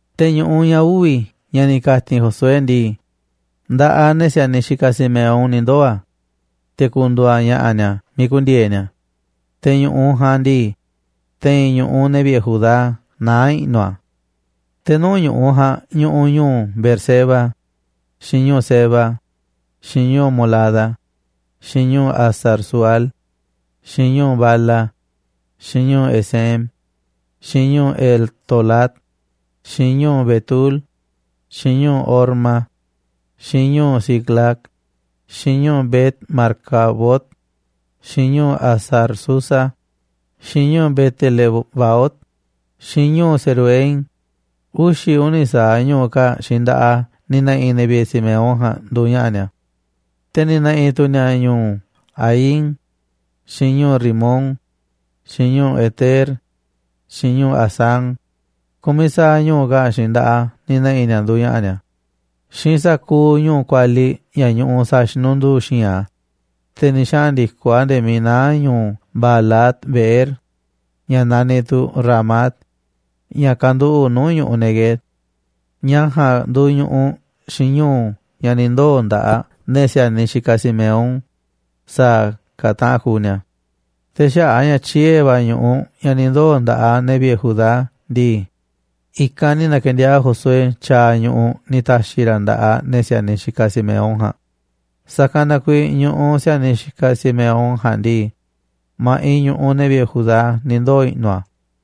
Te̱ ñu̱ꞌuꞌ ña̱ uvi̱ ña̱ ni̱ ka̱ti̱n Josué ndii, nda̱ꞌaꞌ ne̱ si̱a̱niꞌ xikaꞌ Simeón ni̱ ndoo̱ a̱, te̱ ku̱ndu̱u̱ a̱ ña̱ꞌa̱ ni̱a̱ miiꞌ ku̱ndi̱e̱e̱ ni̱a̱. Te̱ ñu̱ꞌuꞌ ja̱a̱nꞌ ndii, te̱i̱n ñu̱ꞌuꞌ ne̱ vi̱ꞌe̱ Judá naá i̱ꞌnu̱ a̱. Te̱ nuu̱ꞌ ñu̱ꞌuꞌ ja̱a̱nꞌ ñuꞌuꞌ ñu̱u̱ Beerseba, xiinꞌ ñu̱u̱ Seba, xiinꞌ ñu̱u̱ Molada, xiinꞌ ñu̱u̱ Hazar-sual, xiinꞌ ñu̱u̱ Bala, xiinꞌ Ezem, xiinꞌ ñu̱u̱ Eltolad, xiinꞌ ñu̱u̱ Betul, xiinꞌ ñu̱u̱ Horma, xiinꞌ ñu̱u̱ Siclag, xiinꞌ ñu̱u̱ Bet-marcabot, xiinꞌ ñu̱u̱ Hazar-susa, xiinꞌ ñu̱u̱ Bet-lebaot, xiinꞌ ñu̱u̱ Saruhén, uxi̱ uni̱ sa̱aꞌ ñu̱u̱ kaa̱ꞌ xiinꞌ nda̱ꞌaꞌ a̱ ni̱ ne̱ꞌi̱ ne̱ vi̱ꞌe̱ Simeón ja̱a̱nꞌ nduuꞌ ña̱ꞌa̱ ni̱a̱. Te̱ ni̱ ne̱ꞌi̱ tu̱ ni̱a̱ ñu̱u̱ Aín, xiinꞌ ñu̱u̱ Rimón, xiinꞌ ñu̱u̱ Eter, xiinꞌ ñu̱u̱ Asán, ku̱miꞌ sa̱aꞌ ñu̱u̱ kaa̱ꞌ xiinꞌ nda̱ꞌaꞌ a̱ ni̱ ne̱ꞌi̱ ni̱a̱ nduuꞌ ña̱ꞌa̱ ni̱a̱, xiinꞌ sa̱kuuꞌ ñu̱u̱ kualiꞌ ña̱ ñuꞌuꞌ sa̱a̱ xinunduu xi̱i̱nꞌ a̱, te̱ ni̱ xaꞌa̱n ndi̱koꞌ a̱ nde̱e̱ miiꞌ naá ñu̱u̱ Baalat-beer, ña̱ naniꞌ tu̱ Ramat, ña̱ kanduꞌu̱ꞌ nuu̱ꞌ ñu̱ꞌuꞌ Neguev. Ña̱ ja̱a̱nꞌ nduuꞌ ñu̱ꞌuꞌ xiinꞌ ñu̱u̱ ña̱ ni̱ ndoo̱ nda̱ꞌaꞌ ne̱ si̱a̱niꞌ xikaꞌ Simeón, sa̱a̱ ka̱ taꞌan kuuꞌ ni̱a̱. Te̱ xaꞌa̱ꞌ a̱ ña̱ tyiee̱ va̱ ñu̱ꞌuꞌ ña̱ ni̱ ndoo̱ nda̱ꞌaꞌ ne̱ vi̱ꞌe̱ Judá ndii, i̱kanꞌ ni̱ na̱ke̱ndiaa̱ꞌ Josué tyaaꞌ ñu̱ꞌuꞌ ni̱ ta̱xi̱ ra̱ nda̱ꞌaꞌ ne̱ si̱a̱niꞌ xikaꞌ Simeón ja̱a̱nꞌ, sa̱kanꞌ na kuiiꞌ ñu̱ꞌuꞌ si̱a̱niꞌ xikaꞌ Simeón ja̱a̱nꞌ ndii, ma̱ꞌiꞌ ñu̱ꞌuꞌ ne̱ vi̱ꞌe̱ Judá ni̱ ndoo̱ i̱ꞌnu̱ a̱.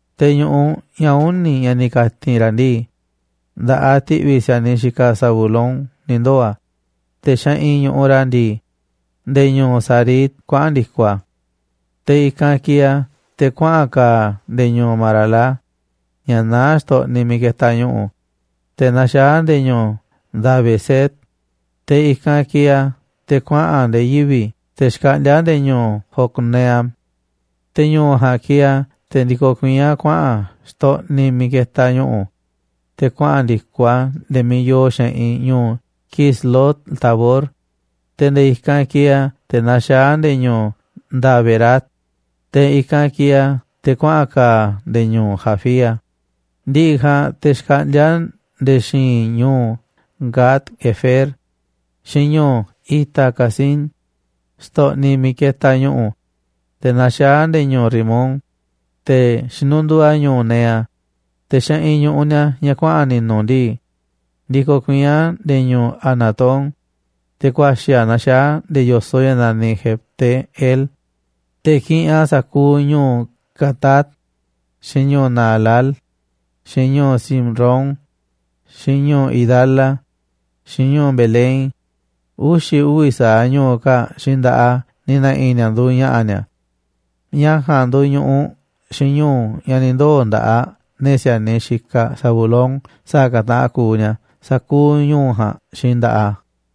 Te̱ ñu̱ꞌuꞌ ña̱ uni̱, ña̱ ni̱ ka̱ti̱n ra̱ ndii, nda̱ꞌaꞌ ti̱ꞌvi̱ si̱a̱niꞌ xikaꞌ Zabulón ni̱ ndoo̱ a̱. Te̱ xeꞌinꞌ ñu̱ꞌuꞌ ni̱a̱ ndii, nde̱e̱ ñu̱u̱ Sarid kuaꞌa̱n ndi̱koꞌ a̱. Te̱ i̱kanꞌ kieeꞌ a̱ te̱ kuaꞌa̱n ka̱a̱ a̱ nde̱e̱ ñu̱u̱ Marala, ña̱ naá xtoꞌniꞌ miiꞌ ketaꞌ ñu̱ꞌu̱, te̱ naxaá a̱ nde̱e̱ ñu̱u̱ Dabeset, te̱ i̱kanꞌ kieeꞌ a̱ te̱ kuaꞌa̱n a̱ nde̱e̱ yivi̱ ña̱ xkaꞌndíá nuu̱ꞌ ñu̱u̱ Jocneam. Te̱ ñu̱u̱ ja̱a̱nꞌ kieeꞌ a̱ te̱ ndikoꞌ kuiín a̱ kuaꞌa̱n a̱ xtoꞌniꞌ miiꞌ ketaꞌ ñu̱ꞌu̱, te̱ kuaꞌa̱n ndi̱koꞌ a̱ nde̱e̱ miiꞌ yoo xeꞌinꞌ ñu̱u̱ Quislot-tabor, te̱ nde̱e̱ i̱kanꞌ kieeꞌ a̱ te̱ naxaá a̱ nde̱e̱ ñu̱u̱ Daberat, te̱ i̱kanꞌ kieeꞌ a̱ te̱ kuaꞌa̱n ka̱a̱ a̱ nde̱e̱ ñu̱u̱ Jafía. Ndi̱ꞌi̱ ja̱a̱nꞌ te̱ xkaꞌndíá a̱ nde̱e̱ xi̱i̱nꞌ ñu̱u̱ Gat-hefer, xiinꞌ ñu̱u̱ Ita-cazín xtoꞌniꞌ miiꞌ ketaꞌ ñu̱ꞌu̱, te̱ naxaá a̱ nde̱e̱ ñu̱u̱ Rimón, te̱ xinunduu a̱ ñu̱u̱ Nea. Te̱ xeꞌinꞌ ñu̱ꞌuꞌ ni̱a̱ ña̱ kuaꞌa̱n ni̱nu̱ ndii, ndikoꞌ kuiín a̱ nde̱e̱ ñu̱u̱ Hanatón, te̱ ku̱a̱xi̱ a̱ naxaá a̱ nde̱e̱ yo̱soꞌ ña̱ naniꞌ Jefte-el, te̱ kiꞌinꞌ a̱ sa̱kuuꞌ ñu̱u̱ Catat, xiinꞌ ñu̱u̱ Naalal, xiinꞌ ñu̱u̱ Simrón, xiinꞌ ñu̱u̱ Idala, xiinꞌ ñu̱u̱ Belén, uxi̱ uvi̱ sa̱aꞌ ñu̱u̱ kaa̱ꞌ xiinꞌ nda̱ꞌaꞌ a̱ ni̱ ne̱ꞌi̱ ni̱a̱ nduuꞌ ña̱ꞌa̱ ni̱a̱. Ña̱ ja̱a̱nꞌ nduuꞌ ñu̱ꞌuꞌ xiinꞌ ñu̱u̱ ña̱ ni̱ ndoo̱ nda̱ꞌaꞌ ne̱ si̱a̱niꞌ xikaꞌ Zabulón sa̱a̱ ka̱ taꞌan kuuꞌ ni̱a̱ sa̱kuuꞌ ñu̱u̱ ja̱a̱nꞌ xiinꞌ nda̱ꞌaꞌ a̱.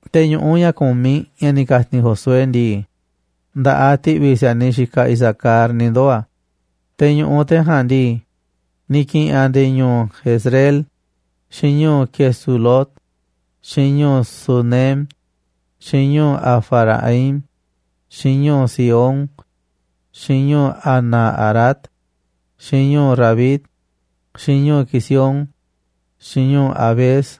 Te̱ ñu̱ꞌuꞌ ña̱ ku̱miꞌ ña̱ ni̱ ka̱ti̱n Josué ndii, nda̱ꞌaꞌ ti̱ꞌvi̱ si̱a̱niꞌ xikaꞌ Isacar ni̱ ndoo̱ a̱. Te̱ ñu̱ꞌuꞌ ne̱ ja̱a̱nꞌ ndii, ni̱ ki̱ꞌi̱n a̱ nde̱e̱ ñu̱u̱ Jezreel, xiinꞌ ñu̱u̱ Quesulot, xiinꞌ ñu̱u̱ Sunem, xiinꞌ ñu̱u̱ Hafaraim, xiinꞌ ñu̱u̱ Sihón, xiinꞌ ñu̱u̱ Anaharat, xiinꞌ ñu̱u̱ Rabit, xiinꞌ ñu̱u̱ Quisión, xiinꞌ ñu̱u̱ Abez,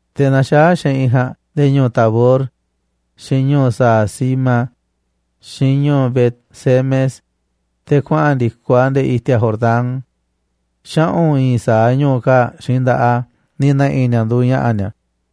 Te̱ naxaá xeꞌinꞌ ja̱a̱nꞌ nde̱e̱ ñu̱u̱ Tabor, xiinꞌ ñu̱u̱ Sahazima, xiinꞌ ñu̱u̱ Bet-semes, te̱ kuaꞌa̱n ndi̱koꞌ a̱ nde̱e̱ i̱ti̱a̱ Jordán. Xaꞌu̱n i̱i̱n sa̱aꞌ ñu̱u̱ kaa̱ꞌ xiinꞌ nda̱ꞌaꞌ a̱ ni̱ na̱ꞌi̱ ni̱a̱ nduuꞌ ña̱ꞌa̱ ni̱a̱.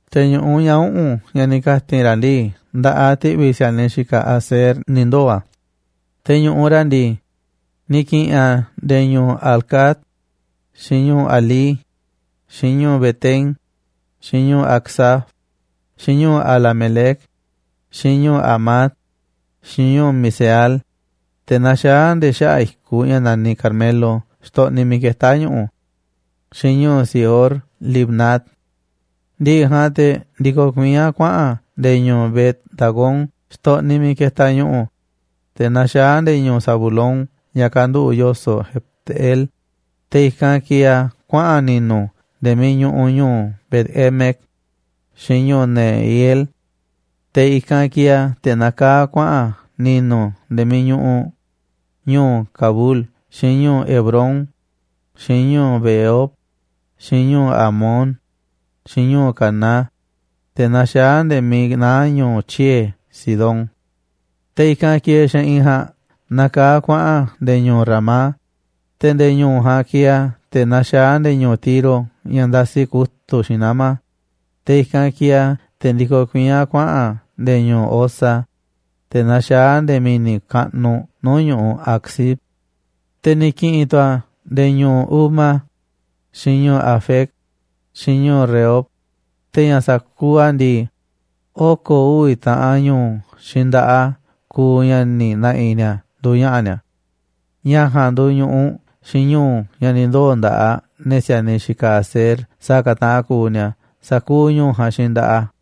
Te̱ ñu̱ꞌuꞌ ña̱ uꞌu̱n ña̱ ni̱ ka̱ti̱n ra̱ ndii, nda̱ꞌaꞌ ti̱ꞌvi̱ si̱a̱niꞌ xikaꞌ Aser ni̱ ndoo̱ a̱, te̱ ñu̱ꞌuꞌ ni̱a̱ ndii, ni̱ ki̱ꞌi̱n a̱ nde̱e̱ ñu̱u̱ Helcat, xiinꞌ ñu̱u̱ Halí, xiinꞌ ñu̱u̱ Betén, xiinꞌ ñu̱u̱ Acsaf, xiinꞌ ñu̱u̱ Alamelec, xiinꞌ ñu̱u̱ Amad, xiinꞌ ñu̱u̱ Miseal, te̱ naxaá nde̱e̱ xaꞌa̱ꞌ i̱kuꞌ ña̱ naniꞌ Carmelo xtoꞌniꞌ miiꞌ ketá ñu̱ꞌu̱, xiinꞌ ñu̱u̱ Sihorlibnat. Ndi̱ꞌi̱ ja̱a̱nꞌ te̱ ndikoꞌ kuiín a̱ kuaꞌa̱n a̱ nde̱e̱ ñu̱u̱ Bet-dagón xtoꞌniꞌ miiꞌ ketaꞌ ñu̱ꞌu̱, te̱ naxaá a̱ nde̱e̱ ñu̱u̱ Zabulón ña̱ kanduꞌu̱ꞌ yo̱soꞌ Jefte-el. Te̱ i̱kanꞌ kieeꞌ a̱ kuaꞌa̱n a̱ ni̱nu̱ nde̱e̱ miiꞌ ñuꞌuꞌ ñu̱u̱ Bet-emec, xiinꞌ ñu̱u̱ Neiel. Te̱ i̱kanꞌ kieeꞌ a̱ te̱ nakaá kuaꞌa̱n a̱ ni̱nu̱ nde̱e̱ miiꞌ ñuꞌuꞌ ñu̱u̱ Cabul, xiinꞌ ñu̱u̱ Hebrón, xiinꞌ ñu̱u̱ Rehob, xiinꞌ ñu̱u̱ Hamón, xiinꞌ ñu̱u̱ Caná, te̱ naxaá a̱ nde̱e̱ miiꞌ naá ñu̱u̱ tyiee̱ Sidón. Te̱ i̱kanꞌ kieeꞌ xeꞌinꞌ ja̱a̱nꞌ nakaá kuaꞌa̱n a̱ nde̱e̱ ñu̱u̱ Ramá, te̱ nde̱e̱ ñu̱u̱ ja̱a̱nꞌ kieeꞌ a̱ te̱ naxaá a̱ nde̱e̱ ñu̱u̱ Tiro ña̱ ndasi kutu̱ꞌ xiinꞌ nama̱, te̱ i̱kanꞌ kieeꞌ a̱ te̱ ndikoꞌ kuiín a̱ kuaꞌa̱n a̱ nde̱e̱ ñu̱u̱ Hosa, te̱ naxaá a̱ nde̱e̱ mi̱ni̱ kaꞌnuꞌ nuu̱ꞌ ñu̱ꞌuꞌ ñu̱u̱ Aczib. Te̱ ni̱ ki̱ꞌi̱n tu̱ a̱ nde̱e̱ ñu̱u̱ Uma, xiinꞌ ñu̱u̱ Afec, xiinꞌ ñu̱u̱ Rehob. Te̱ ña̱ sa̱kuuꞌ a̱ ndii, oko̱ uvi̱ taꞌan ñu̱u̱ xiinꞌ nda̱ꞌaꞌ a̱ kuuꞌ ña̱ ni̱ na̱ꞌi̱ ni̱a̱ nduuꞌ ña̱ꞌa̱ ni̱a̱. Ña̱ ja̱a̱nꞌ nduuꞌ ñu̱ꞌuꞌ xiinꞌ ñu̱u̱ ña̱ ni̱ ndoo̱ nda̱ꞌaꞌ ne̱ si̱a̱niꞌ xikaꞌ Aser sa̱a̱ ka̱ taꞌan kuuꞌ ni̱a̱ sa̱kuuꞌ ñu̱u̱ ja̱a̱nꞌ xiinꞌ nda̱ꞌaꞌ a̱.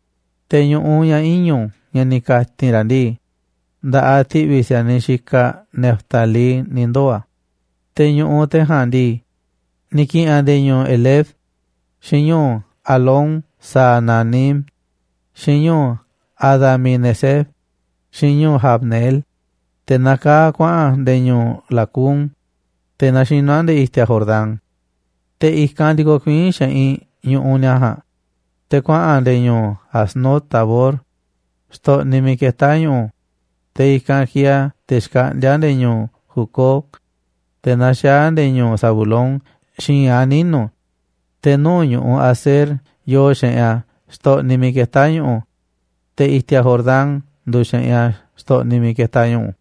Te̱ ñu̱ꞌuꞌ ña̱ iñu̱ ña̱ ni̱ ka̱ti̱n ra̱ ndii, nda̱ꞌaꞌ ti̱ꞌvi̱ si̱a̱niꞌ xikaꞌ Neftalí ni̱ ndoo̱ a̱. Te̱ ñu̱ꞌuꞌ ne̱ ja̱a̱nꞌ ndii, ni̱ ki̱ꞌi̱n a̱ nde̱e̱ ñu̱u̱ Helef, xiinꞌ ñu̱u̱ Alón-saananim, xiinꞌ ñu̱u̱ Adami-neceb, xiinꞌ ñu̱u̱ Jabneel, te̱ nakaá a̱ kuaꞌa̱n a̱ nde̱e̱ ñu̱u̱ Lacum, te̱ naxinú a̱ nde̱e̱ i̱ti̱a̱ Jordán. Te̱ i̱kanꞌ ndikoꞌ kuiín xeꞌinꞌ ñu̱ꞌuꞌ ni̱a̱ ja̱a̱nꞌ, te̱ kuaꞌa̱n a̱ nde̱e̱ ñu̱u̱ Aznot-tabor, xtoꞌniꞌ miiꞌ ketá ñu̱ꞌu̱, te̱ i̱kanꞌ kieeꞌ a̱ te̱ xkaꞌndíá a̱ nde̱e̱ ñu̱u̱ Hucoc, te̱ naxaá a̱ nde̱e̱ ñu̱u̱ Zabulón xi̱i̱nꞌ a̱ ninu̱, te̱ nuu̱ꞌ ñu̱ꞌuꞌ Aser yoo xeꞌinꞌ a̱ xtoꞌniꞌ miiꞌ ketá ñu̱ꞌu̱, te̱ i̱ti̱a̱ Jordán nduuꞌ xeꞌinꞌ a̱ xtoꞌniꞌ miiꞌ ketaꞌ ñu̱ꞌu̱.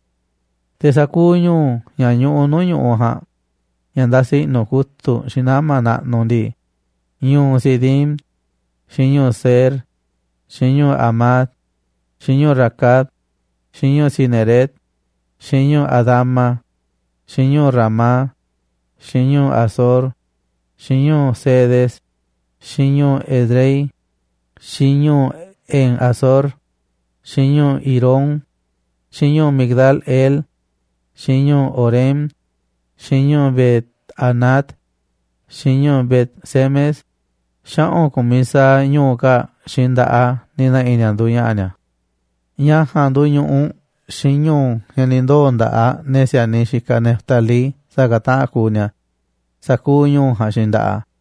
Te̱ sa̱kuuꞌ ñu̱u̱ ña̱ ñuꞌuꞌ nuu̱ꞌ ñu̱ꞌuꞌ ja̱a̱nꞌ ña̱ ndasi i̱ꞌnu̱ kutu̱ꞌ xiinꞌ nama̱ naꞌnuꞌ ndii, ñu̱u̱ Sidim, xiinꞌ ñu̱u̱ Zer, xiinꞌ ñu̱u̱ Hamat, xiinꞌ ñu̱u̱ Racat, xiinꞌ ñu̱u̱ Cineret, xiinꞌ ñu̱u̱ Adama, xiinꞌ ñu̱u̱ Ramá, xiinꞌ ñu̱u̱ Hazor, xiinꞌ ñu̱u̱ Cedes, xiinꞌ ñu̱u̱ Edrei, xiinꞌ ñu̱u̱ En-hazor, xiinꞌ ñu̱u̱ Irón, xiinꞌ ñu̱u̱ Migdal-el, xiinꞌ ñu̱u̱ Horem, xiinꞌ ñu̱u̱ Bet-anat, xiinꞌ ñu̱u̱ Bet-semes, xaꞌu̱n ku̱miꞌ sa̱aꞌ ñu̱u̱ kaa̱ꞌ xiinꞌ nda̱ꞌaꞌ a̱ ni̱ ne̱ꞌi̱ ni̱a̱ nduuꞌ ña̱ꞌa̱ ni̱a̱. Ña̱ ja̱a̱nꞌ nduuꞌ ñu̱ꞌuꞌ xiinꞌ ñu̱u̱ ña̱ ni̱ ndoo̱ nda̱ꞌaꞌ ne̱ si̱a̱niꞌ xikaꞌ Neftalí sa̱a̱ ka̱ taꞌan kuuꞌ ni̱a̱, sa̱kuuꞌ ñu̱u̱ ja̱a̱nꞌ xiinꞌ nda̱ꞌaꞌ a̱.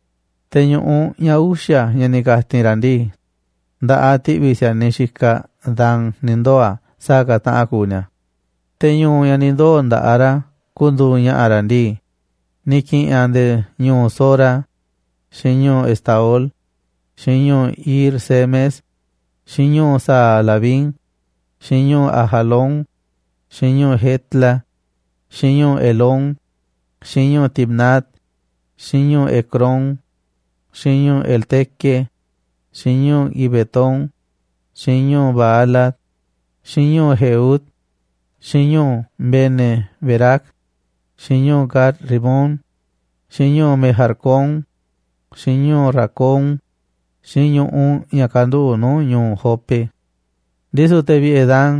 Te̱ ñu̱ꞌuꞌ ña̱ uxa̱ ña̱ ni̱ ka̱ti̱n ra̱ ndii, nda̱ꞌaꞌ ti̱ꞌvi̱ si̱a̱niꞌ xikaꞌ Dan ni̱ ndoo̱ a̱ sa̱a̱ ka̱ taꞌan kuuꞌ ni̱a̱. Te̱ ñu̱u̱ ña̱ ni̱ ndoo̱ nda̱ꞌaꞌ ni̱a̱ ku̱ndu̱u̱ ña̱ꞌa̱ ni̱a̱ ndii, ni̱ ki̱ꞌi̱n a̱ nde̱e̱ ñu̱u̱ Zora, xiinꞌ ñu̱u̱ Estaol, xiinꞌ ñu̱u̱ Ir-semes, xiinꞌ ñu̱u̱ Saalabín, xiinꞌ ñu̱u̱ Ajalón, xiinꞌ ñu̱u̱ Jetla, xiinꞌ ñu̱u̱ Elón, xiinꞌ ñu̱u̱ Timnat, xiinꞌ ñu̱u̱ Ecrón, xiinꞌ ñu̱u̱ Elteque, xiinꞌ ñu̱u̱ Gibetón, xiinꞌ ñu̱u̱ Baalat, xiinꞌ ñu̱u̱ Jehúd, xiinꞌ ñu̱u̱ Bene-berac, xiinꞌ ñu̱u̱ Gat-rimón, xiinꞌ ñu̱u̱ Mejarcón, xiinꞌ ñu̱u̱ Racón, xiinꞌ ñu̱ꞌuꞌ ña̱ kanduꞌu̱ꞌ nuu̱ꞌ ñu̱u̱ Jope. Ndisu̱ te̱ vi̱ꞌe̱ Dan,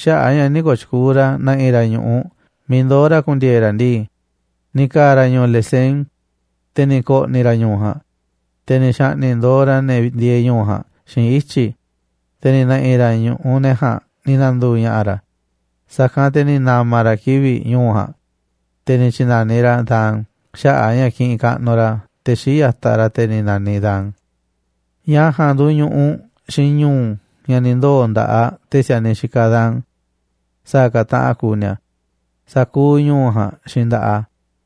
xaꞌa̱ꞌ a̱ ña̱ nï̱ kooꞌ tyukuuꞌ ra̱ na̱ꞌi̱ ra̱ ñu̱ꞌuꞌ miiꞌ ndoo̱ ra̱ ku̱ndi̱e̱e̱ ra̱ ndii, ni̱ ka̱a̱ ra̱ ñu̱u̱ Lesem, te̱ ni̱ ko̱ꞌni̱ ra̱ ñu̱u̱ ja̱a̱nꞌ, te̱ ni̱ xa̱ꞌni̱ꞌ ndo̱o̱ ra̱ ne̱ ndieeꞌ ñu̱u̱ ja̱a̱nꞌ xiinꞌ ityi̱, te̱ ni̱ ne̱ꞌi̱ ra̱ ñu̱ꞌuꞌ ne̱ ja̱a̱nꞌ ni̱ na̱ndu̱u̱ ña̱ꞌa̱ ra̱. Sa̱kanꞌ te̱ ni̱ na̱ma̱ ra̱ kivi̱ꞌ ñu̱u̱ ja̱a̱nꞌ, te̱ ni̱ tyi̱na̱niꞌ ra̱ a̱ Dan xaꞌa̱ꞌ ña̱ kiꞌinꞌ kaꞌnuꞌ ra̱ te̱ xii̱ꞌ ya̱taꞌ ra̱, te̱ ni̱ na̱niꞌ Dan. Ña̱ ja̱a̱nꞌ nduuꞌ ñu̱ꞌuꞌ xiinꞌ ñu̱u̱ ña̱ ni̱ ndoo̱ nda̱ꞌaꞌ ne̱ si̱a̱niꞌ xikaꞌ Dan sa̱a̱ ka̱ taꞌan kuuꞌ ni̱a̱, sa̱kuuꞌ ñu̱u̱ ja̱a̱nꞌ xiinꞌ nda̱ꞌaꞌ a̱.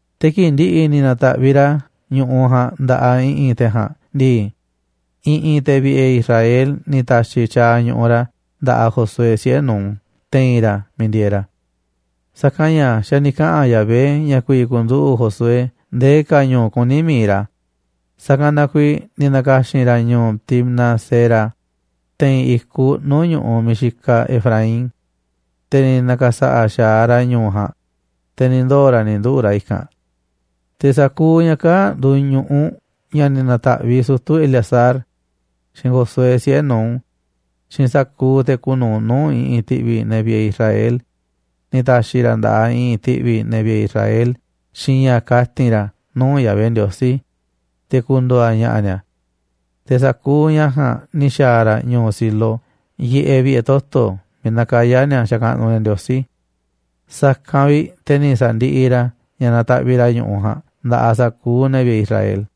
Te̱ kii̱ꞌ ndi̱ꞌi̱ ni̱ na̱ta̱ꞌviꞌ ra̱ ñu̱ꞌuꞌ ja̱a̱nꞌ nda̱ꞌaꞌ i̱ꞌi̱n te̱ ja̱a̱nꞌ ndii, i̱ꞌi̱n te̱ vi̱ꞌe̱ Israel ni̱ ta̱xi̱ tyaaꞌ ñu̱ꞌuꞌ ra̱ nda̱ꞌaꞌ Josué, siꞌe̱ Nun, te̱i̱n ra̱ miiꞌ ndieeꞌ ra̱. Sa̱kanꞌ ña̱ xa̱ ni̱ kaꞌa̱n Yahvé ña̱ ku̱vi̱ ku̱nduꞌu̱ꞌ Josué ndee ka̱ ñu̱u̱ kuní mi̱iꞌ ra̱, sa̱kanꞌ na kuiiꞌ ni̱ na̱ka̱xi̱n ra̱ ñu̱u̱ Timnat-sera te̱i̱n i̱kuꞌ nuu̱ꞌ ñu̱ꞌuꞌ miiꞌ xikaꞌ Efraín. Te̱ ni̱ na̱ka̱sa̱ꞌa̱ xa̱aꞌ ra̱ ñu̱u̱ ja̱a̱nꞌ, te̱ ni̱ ndoo̱ ra̱ ni̱ nduꞌu̱ꞌ ra̱ i̱kanꞌ. Sa̱kuuꞌ ña̱ kaa̱ꞌ nduuꞌ ñu̱ꞌuꞌ ña̱ ni̱ na̱ta̱ꞌviꞌ sutu̱ Eleazar, xiinꞌ Josué, siꞌe̱ Nun, xiinꞌ sa̱kuuꞌ te̱ kuuꞌ nu̱uꞌ nuu̱ꞌ i̱ꞌi̱n ti̱ꞌvi̱ ne̱ vi̱ꞌe̱ Israel ni̱ ta̱xi̱ ra̱ nda̱ꞌaꞌ i̱ꞌi̱n ti̱ꞌvi̱ ne̱ vi̱ꞌe̱ Israel xiinꞌ ña̱ kati̱n ra̱ nuu̱ꞌ Yahvé Ndiosí, te̱ ku̱ndu̱u̱ a̱ ña̱ꞌa̱ ni̱a̱. Te̱ sa̱kuuꞌ ña̱ ja̱a̱nꞌ ni̱ xa̱a̱ ra̱ ñu̱u̱ Silo yiꞌeꞌ vi̱ꞌe̱ toto̱ miiꞌ nakayá ni̱a̱ xakaꞌnuꞌ ni̱a̱ Ndiosí. Sa̱kanꞌ vi̱ꞌ te̱ ni̱ sa̱ndiꞌiꞌ ra̱ ña̱ nataꞌviꞌ ra̱ ñu̱ꞌuꞌ ja̱a̱nꞌ nda̱ꞌaꞌ sa̱kuuꞌ ne̱ vi̱ꞌe̱ Israel.